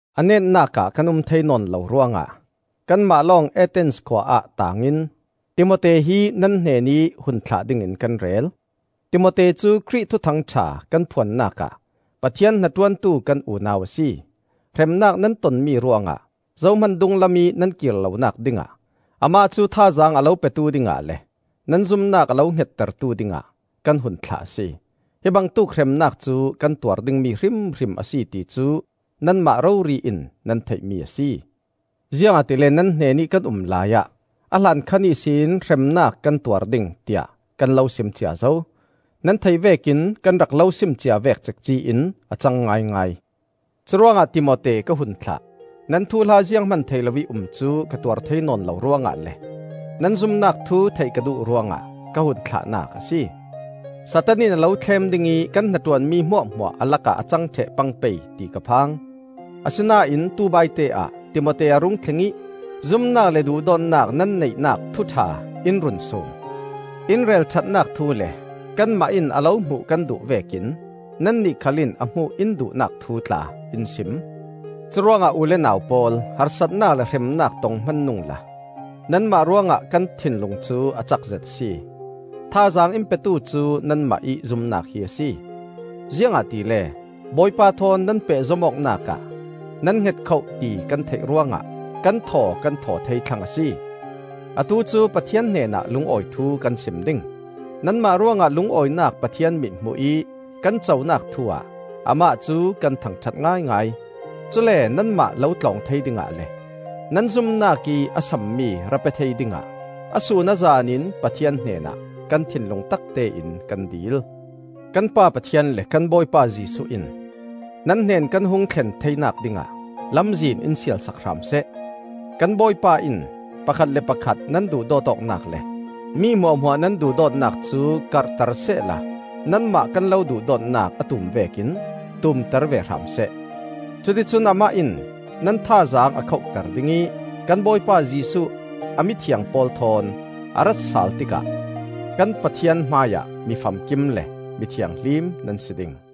A netnak ah kan um thei nawn lo ruangah kanmah lawng Athens khua ah taang in, Timote hi nan hnenih hun thlah dingin kan rel. Timote cu Khrih Thuthang ṭha kan phuannak ah Pathian hnaṭuantu kan unau a si. Hremnak nan tonmi ruangah zohman dunglamih nan kir lonak dingah, amah cu thazaang a lo petu dingah le nan zumnak a lo hngettertu dingah kan hun thlah a si. Hi bangtuk hremnak cu kan tuar dingmi hrimhrim a si ti cu nanmah rori in nan theihmi a si. Ziangahtile nan hnenih kan um laiah a hlankhan ihsin hremnak kan tuar ding, tiah kan lo sim cia zo. Nan theih vekin, kan rak lo sim cia vek cekci in a cang ngaingai. Curuangah Timote ka hun thlah. Nan thuhla zianghman thei loih um cu ka tuar thei nawn lo ruangah le nan zumnak thu theih ka duh ruangah ka hun thlahnak a si. Satan in a lo thlem ding ih kan hnaṭuanmi hmuahhmuah a lakah a cang ṭheh pang pei ti ka phang. Asinain tubaite ah Timote a rung thleng ih zumnak le duhdawtnak nan neihnak thu ṭha in run sum. In relṭhatnak thu le kanmah in a lo hmuh kan duh vekin nannih khal in a hmuh in duhnak thu tla in sim. Curuangah u le nau pawl, harsatnak le hremnak tong hman nungla nanmah ruangah kan thinlung cu a cakzet a si. Thazaang in petu cu nanmah ih zumnak hi a si. Ziangahtile Bawipa thawn nan pehzom awknak ah nan hngetkhoh ti kan theih ruangah kan thaw kan thaw thei thlang a si. Atu cu Pathian hnenah lungawi thu kan sim ding. Nanmah ruangah lungawinak Pathian mithmuh ih kan conak thu-ah Amah cu kan thangṭhat ngaingai. Cule nanmah lo tlawng thei dingah le nan zumnak ih a sammi ra pe thei dingah a sun a zan in Pathian hnenah kan thinlung taktein kan dil. Kan Pa Pathian le kan Bawipa Jesuh in nan hnen kan hung thlen theinak dingah lamzin in sialsak hram seh! Kan Bawipa in pakhat le pakhat nan duhdawt awknak le mi hmuahhmuah nan duhdawtnak cu karhter sehla nanmah kan lo duhdawtnak a tum vekin tumter ve hram seh. Cuticun amah in nan thazaang a khohter ding ih kan Bawipa Jesuh a mithiang pawl thawn a ratsal tikah kan Pathian hmaiah mi famkim le mi thianghlim nan si ding.